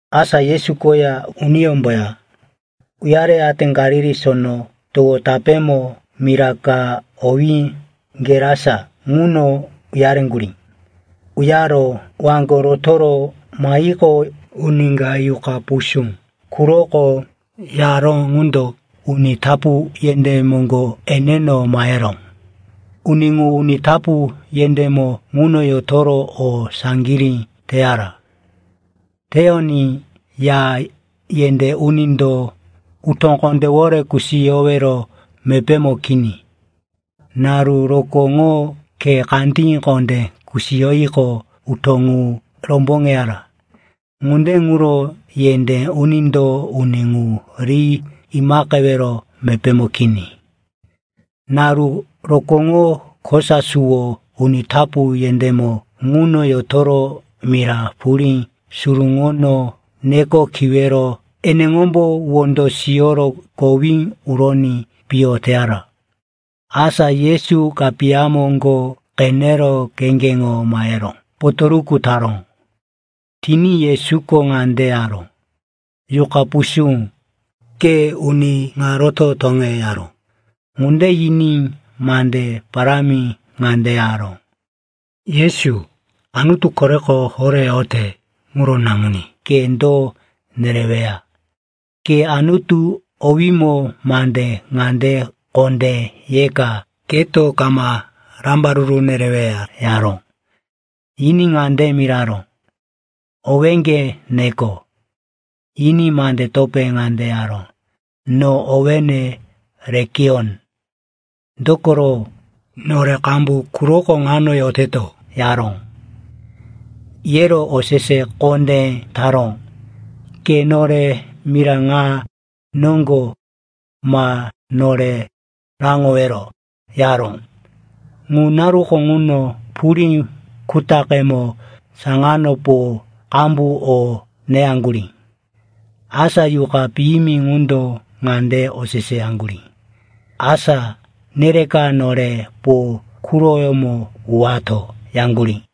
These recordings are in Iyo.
Asa Yesu koya uniyómboya uyareyate Galili Sono Towo tapémo mira ka owí Gerasa ŋuno uyareŋgurí. Uyaro waŋgo rotoro mahiqo, uni ka yuqa pusú quroko yaró ŋundo uni tapu yendé moŋgo eneno maheró. Uni ŋu uni tapu yendémo ŋuno yotoro o saŋgirí teyara. Teyoní ya yendé unindo utó kondéwore kusiyowero mepémo kini. Naru rokóŋo khe kandí kondé kusiyoyiqo, utó ŋu romboŋeyara. Ŋunde ŋuro yendé unindo uni ŋu ri imaqewero mepémo kini. Naru rokóŋo, kosa suwo uni tapu yendémo ŋuno yotoro mira purí suruŋono neko kiwero eneŋombo wondo siyoro kowí uroní piyo teyara. Asa Yesu kapiya moŋgo qenero kheŋgeŋo mahero potoruku taró. Tiní Yesuko ŋande yaró, “Yuqa pusú, ke uni ŋa roto toŋe!” yaró. Ŋunde yiní mande parámi ŋande yaró, “Yesu, Anutu Koreko Horé yote ŋuro Naŋuní, ke do nereweya? Ke Anutu owímo mande ŋande kondé yeka, keto kama rambaruru nereweya!” yaró. Yiní ŋande miraró, “Owéŋge neko.” Yiní mande topé ŋande yaró, “No owéne Lekiyon, dokoro nore qambu quroko ŋano yoteto,” yaró. Yero osese kondé taró, “Ke nore mira ŋa noŋgo ma nore raŋowero,” yaró. Ŋu naruko ŋuno purí kutaqemo saŋano po qambu o neyaŋgurí. Asa yuqa piyimi ŋundo ŋande oseseyaŋgurí, “Asá nereka nore po quroyemo uwato,” yaŋgurí.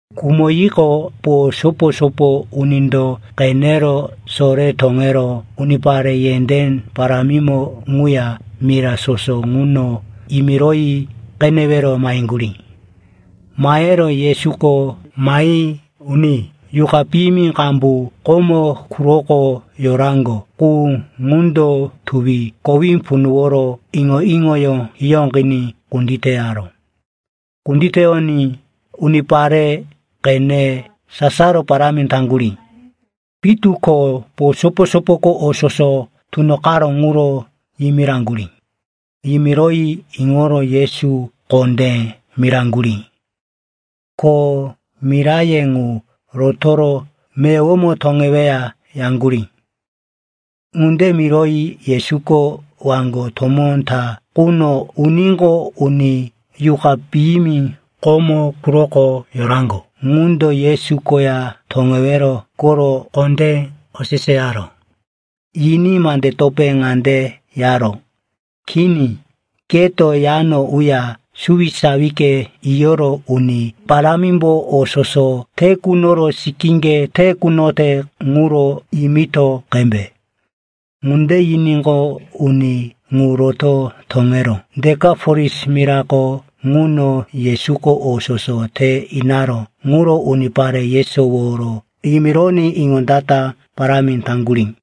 Khumoyiqo, po sopo-sopo unindo qenero sore toŋero unipare yendé parámimo ŋuya mira soso ŋuno yimiroyi qenewero maheŋgurí. Mahero Yesuko mahi uni yuqa piyimi qambu komo quroko yoraŋgo qu ŋundo tuwi kowí punuworo iŋo-iŋoyó hiyóqiní kunditeyaró. Kunditeyoní unipare qene sasaro parámi taŋgurí. Pitu ko po sopo-sopoko o soso tunoqaró ŋuro yimiraŋgurí. Yimiroyi iŋoro Yesu kondé miraŋgurí, ko miraye ŋu rotoro meyowomo toŋeweya, yaŋgurí. Ŋunde miroyi Yesuko waŋgo tomó ta quno uníqo, uni yuqa piyimi komo quroko yoraŋgo ŋundo Yesu koya toŋewero koro kondé oseseyaró. Yiní mande topé ŋande yaró, “Kini, keto yano uya suwisawike yiyoro Uni Parámimbo o soso te kunoro sikíŋge te kunote ŋuro yimito qembe.” Ŋunde yiníqo, uni ŋu roto toŋero Dekapolis mirako ŋuno Yesuko o soso te inaró ŋuro unipare yesoworo yimironí iŋondata parámi taŋgurí.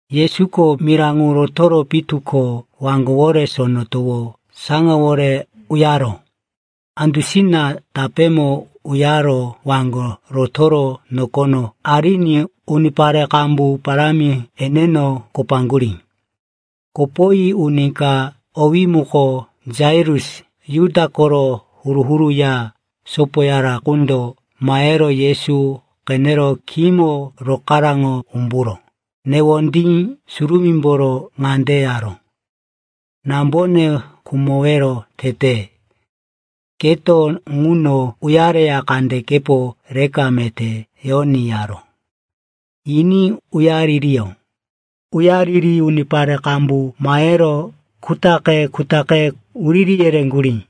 Yesuko mira ŋu rotoro pitu ko waŋgowore Sono Towo saŋawore uyaró. Andusina tapémo uyaro waŋgo rotoro nokono ariní unipare qambu parámi eneno kopaŋgurí. Kopoyi uni ka, owí muko Jairus, Juda koro huru-huru ya sopoyara qundo mahero Yesu qenero khímo rokaraŋo umburo newondí surumímboro ŋande yaró, “Nambone khumowero tete. Keto ŋuno uyareya kandekepo reka meté yoní,” yaró. Yiní uyaririyó. Uyariri unipare qambu mahero kutaqe-kutaqe wuriri yereŋgurí.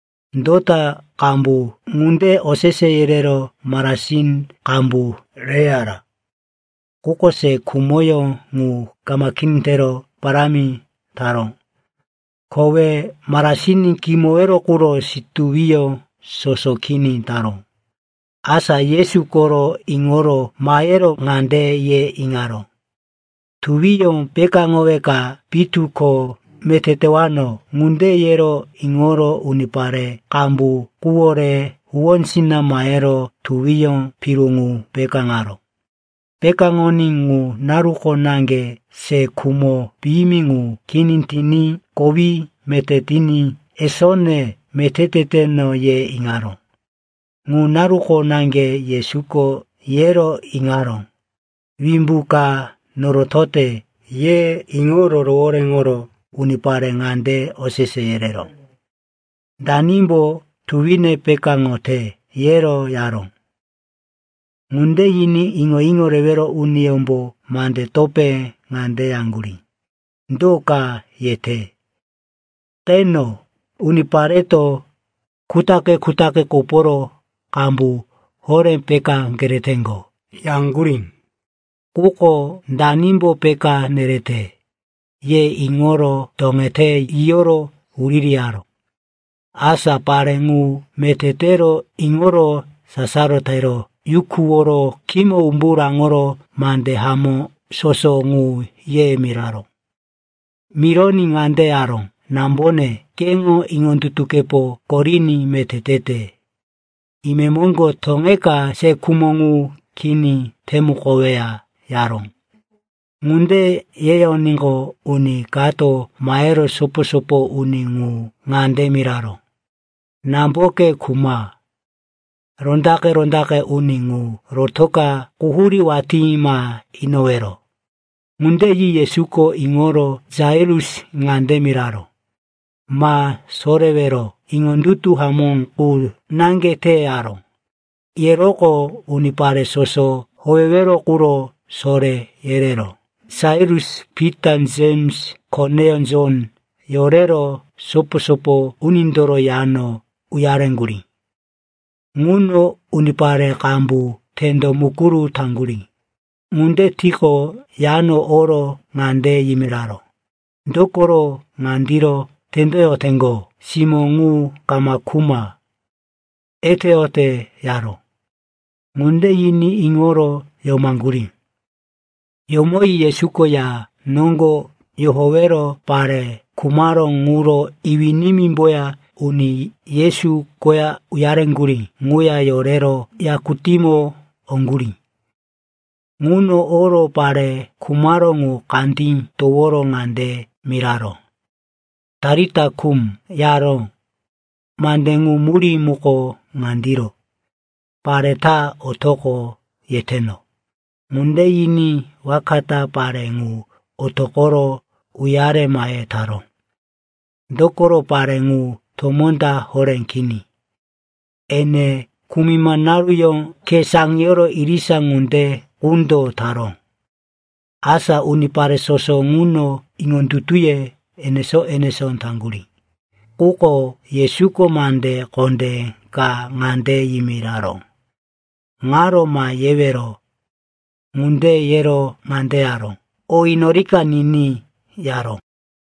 Dota qambu ŋunde osese yerero marasin qambu reyara. Quko se khumoyó ŋu kama kini tero parámi taró. Kowe marasin kimowero quro situwiyó soso kini taró. Asa Yesu koro iŋoro mahero ŋande ye iŋaró, “Tuwiyó pekáŋoweka pitu ko meté tewano.” Ŋunde yero iŋoro unipare qambu quwore huwósina mahero tuwiyó piru ŋu pekáŋaró. Pekáŋoní ŋu naruko naŋge se khumo piyimi ŋu kini tiní kowí meté tiní, “Esone, meté teteno,” ye iŋaró. Ŋu naruko naŋge Yesuko yero iŋaró, “Wimbu ka norotote,” ye iŋoro rohoréŋoro unipare ŋande osese yereró, “Danimbo tuwine pekáŋote?” yero yaró. Ŋunde yiní iŋo-iŋo rewero uniyómbo mande topé ŋande yaŋgurí, “Do ka yete? Qeno, unipareto kutaqe-kutaqe koporo qambu horé peká kereteŋgo,” yaŋgurí. Quko “Danimbo peká nerete?” ye iŋoro toŋete yiyoro wuririyaró. Asa pare ŋu meté tero iŋoro sasaro tero yukuworo khímo umbu raŋoro mande hamó soso ŋu ye miraró. Mironí ŋande yaró, “Nambone, keŋo iŋondutukepo koriní meté tete. Imemoŋgo toŋeka se khumo ŋu kini temukoweya,” yaró. Ŋunde yeyoníqo, uni kato mahero sopo-sopo uni ŋu ŋande miraró, “Namboke khuma. Rondaqe-rondaqe uni ŋu rotoka quhurí watí ma inowero.” Ŋunde yi Yesuko iŋoro Jairus ŋande miraró, “Ma sorewero, iŋondutu hamó qu naŋge te,” yaró. Yeroqo unipare soso howewero quro soré yerero Jairus, Pita, Jems, koneyó Jon yorero sopo-sopo unindoro yano uyareŋgurí. Ŋuno unipare qambu tendo mukuru taŋgurí. Ŋunde tiqo, yano oro ŋande yimiraró, “Dokoro ŋandiro tendoyoteŋgo? Simó ŋu kama khuma. Eteyote,” yaró. Ŋunde yiní iŋoro yomaŋgurí. Yomoyi Yesuko ya noŋgo yohowero pare khumaró ŋuro iwí-nimímboya uni Yesu koya uyareŋgurí ŋuya yorero yakutímo oŋgurí. Ŋuno oro pare khumaró ŋu kandí toworo ŋande miraró, “Talita kum,” yaró. (Mande ŋu murí muko ŋandiro: “Pare ta otoqo, yeteno.”) Ŋunde yiní waka ta pare ŋu otoqoro uyare mahe taró. Dokoro pare ŋu tomó ta horé kini, ene kumima naruyó khe saŋiyoro irisa ŋunde qundo taró. Asa unipare soso ŋuno iŋondutuye enesó-enesó taŋgurí. Quko Yesuko mande kondé ka ŋande yimiraró, “Ŋaro ma yewero.” Ŋunde yero ŋande yaró, “O inorika niní,” yaró.